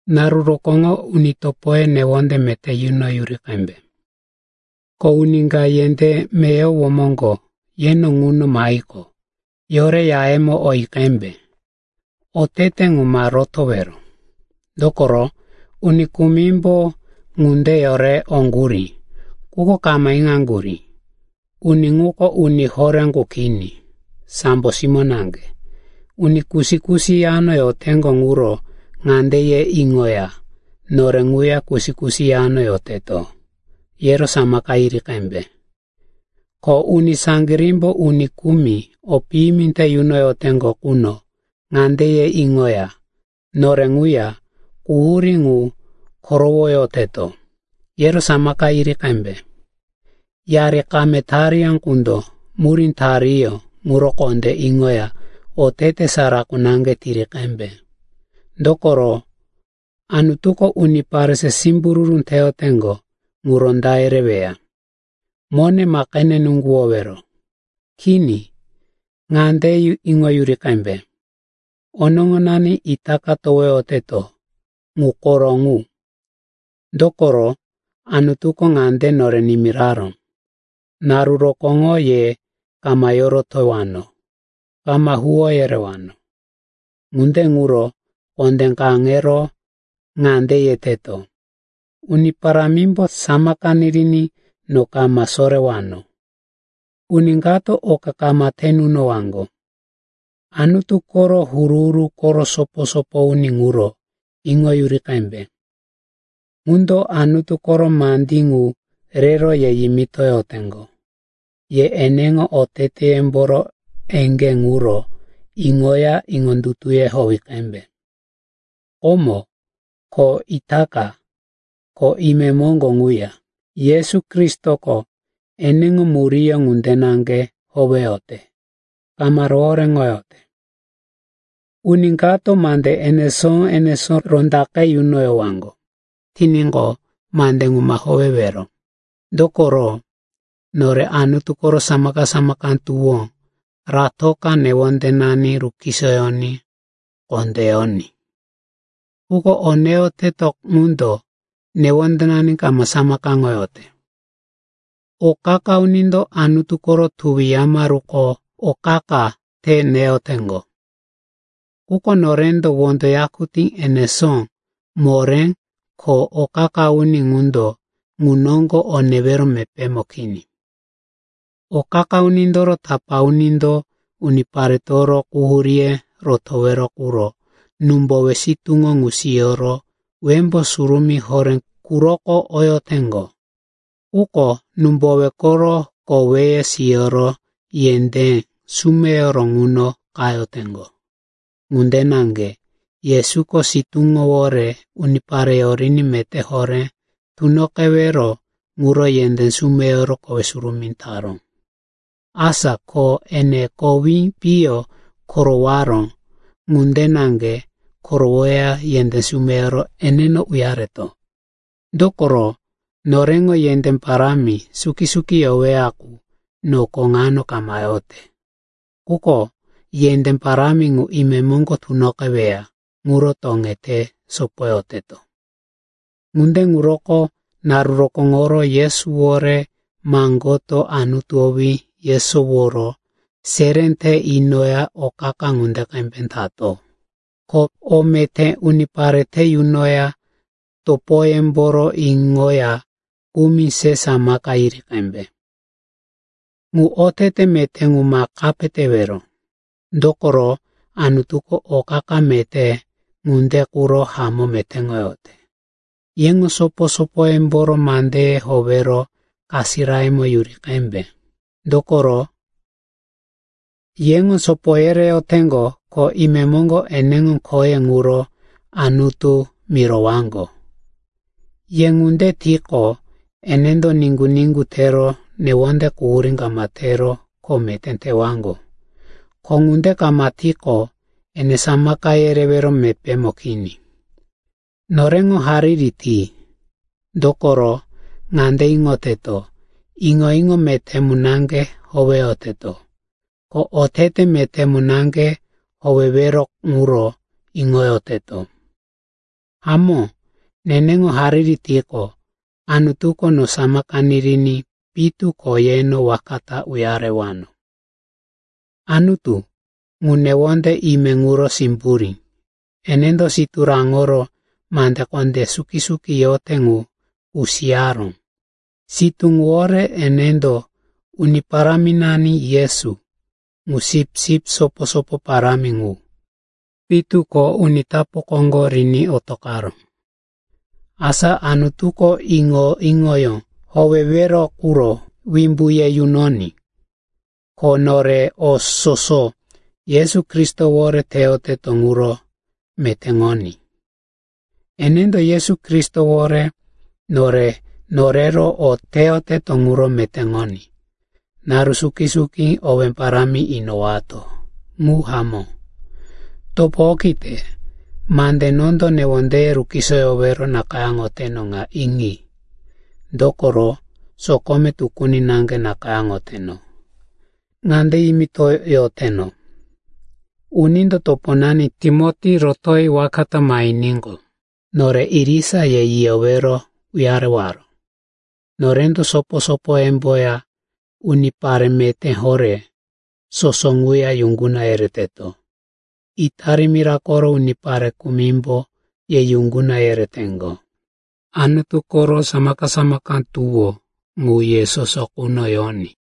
Naru rokóŋo uni topoye newonde meté yunoyuri qembe. Ko uni ka yendé meyowo moŋgo yeno ŋuno mahiqo, yore yayemo oyi qembe. Otete ŋu ma rotowero, dokoro uni kumimbo ŋunde yore oŋgurí, quko kama iŋaŋgurí, uni ŋuko uni horé qu kini, sambo simó naŋge. Uni kusi-kusi yano yoteŋgo ŋuro ŋande ye iŋoya, nore ŋuya kusi-kusi yano yoteto, yero samaka yiri qembe. Ko uni saŋgirímbo uni kumi o piyimi te yunoyoteŋgo quno ŋande ye iŋoya, nore ŋuya quhurí ŋu korowoyoteto, yero samaka yiri qembe. Yari kame tariyó qundo murí tariyó ŋuro kondé iŋoya otete sara qu naŋge tiri qembe. Dokoro Anutuko unipare se simbururu teyoteŋgo ŋu ronda yereweya. Mone ma qene nuŋguwowero. Kini, ŋande iŋoyuri qembe, onoŋonani itaka towoyoteto, ŋu koro ŋu. Dokoro Anutuko ŋande nore nimiraró, “Naru rokóŋo ye kama yorotowano, kama huwó yerewano.” Ŋunde ŋuro kondé kaŋero ŋande yeteto, “Uni Parámimbo samaka niriní no kama sorewano. Uni kato oka kama te nunowaŋgo.” Anutu koro huru-huru koro sopo-sopo uni ŋuro iŋoyuri qembe, ŋundo Anutu koro mandí ŋu rero ye yimitoyoteŋgo. Ye eneŋo oteteyemboro eŋgé ŋuro iŋoya iŋondutuye howi qembe. Komo, ko itaka, ko imemoŋgo ŋuya Yesu Kristoko eneŋo muríyó ŋunde naŋge howeyote, kama rohoréŋoyote. Uni kato mande enesó-enesó rondaqe yunoyowaŋgo tiníqo, mande ŋu ma howewero. Dokoro nore Anutu koro samaka-samaka tuwó ratoka newondenani rukisoyoní kondé yoní. Quko o neyoteto ŋundo newondenani kama samakaŋoyote. O qa-qa unindo Anutu koro tuwi yamaruko o qa-qa te neyoteŋgo. Quko norendo wondo yakutí enesó moré, ko o qa-qa uni ŋundo ŋu noŋgo o newero mepémo kini. O qa-qa unindoro tapá unindo uniparetoro quhuríye rotowero quro númbowe sitúŋo ŋu siyoro Wembó Surumí Horé quroko oyoteŋgo. Quko númbowe koro koweye siyoro yendé sumeyoro ŋuno qayoteŋgo. Ŋunde naŋge Yesuko sitúŋowore unipare yoriní meté horé tunoqewero ŋuro yendé sumeyoro kowe surumí taró. Asa ko ene kowi piyo korowaró ŋunde naŋge korowoya yendé sumeyoro eneno uyareto. Dokoro noreŋo yendé parámi suki yoweya qu noko ŋano kama yote. Quko yendé parámi ŋu imemoŋgo tunoqeweya ŋuro toŋete sopoyoteto. Ŋunde ŋuroko naru rokóŋoro Yesuwore maŋgoto Anutu owí yesoworo seré te inoya o qa-qa ŋunde qembe tato. Ko o meté unipare te yunoya topoyemboro iŋoya kumi se samaka yiri qembe. Ŋu otete meté ŋu ma kape tewero, dokoro Anutuko o qa-qa meté ŋunde quro hamó metéŋoyote. Yeŋo sopo-sopoyemboro mandeye howero kasirayemo yuri qembe, dokoro yeŋo sopo yereyoteŋgo ko imemoŋgo eneŋo khoye ŋuro Anutu mirowaŋgo. Ye ŋunde tiqo, enendo niŋgu-niŋgu tero newonde quhurí kama tero kho meté tewaŋgo. Ko ŋunde kama tiqo, ene samaka yerewero mepémo kini. Noreŋo hariri ti. Dokoro ŋande iŋoteto, iŋo-iŋo meté mu naŋge howeyoteto, ko otete meté mu naŋge howewero ŋuro iŋoyoteto. Hamó, neneŋo hariri tiqo, Anutuko no samaka niriní pitu ko yeno waka ta uyarewano. Anutu, ŋu newonde ime ŋuro simburí, enendo sitú raŋoro mande kondé suki-suki yote ŋu kusiyaró. Sitú ŋuwore enendo Uni Paráminani Yesu, ŋu sipsip sopo-sopo parámi ŋu, pitu ko uni tapu koŋgo riní otoqaró. Asa Anutuko iŋo-iŋoyó howewero quro wimbu ye yunoní. Ko nore o soso Yesu Kristowore teyoteto ŋuro metéŋoní. Enendo Yesu Kristowore nore norero o teyoteto ŋuro metéŋoní. Naru suki-suki owé parámi inowato. Ŋu hamó. Topo okite, mande nondo newondeye rukisoyowero nakayáŋoteno ŋa iŋi, dokoro sokome tukuni naŋge nakayáŋoteno. Ŋande yimitoyoteno, unindo toponani Timoti rotoyi waka ta mahiníqo, nore irisa ye yiyowero uyarewaro. Norendo sopo-sopoyemboya unipare meté horé soso ŋuya yuŋguna yereteto. Itali mira koro unipare kumimbo ye yuŋguna yereteŋgo. Anutu koro samaka-samaka tuwó ŋu ye soso quno yoní.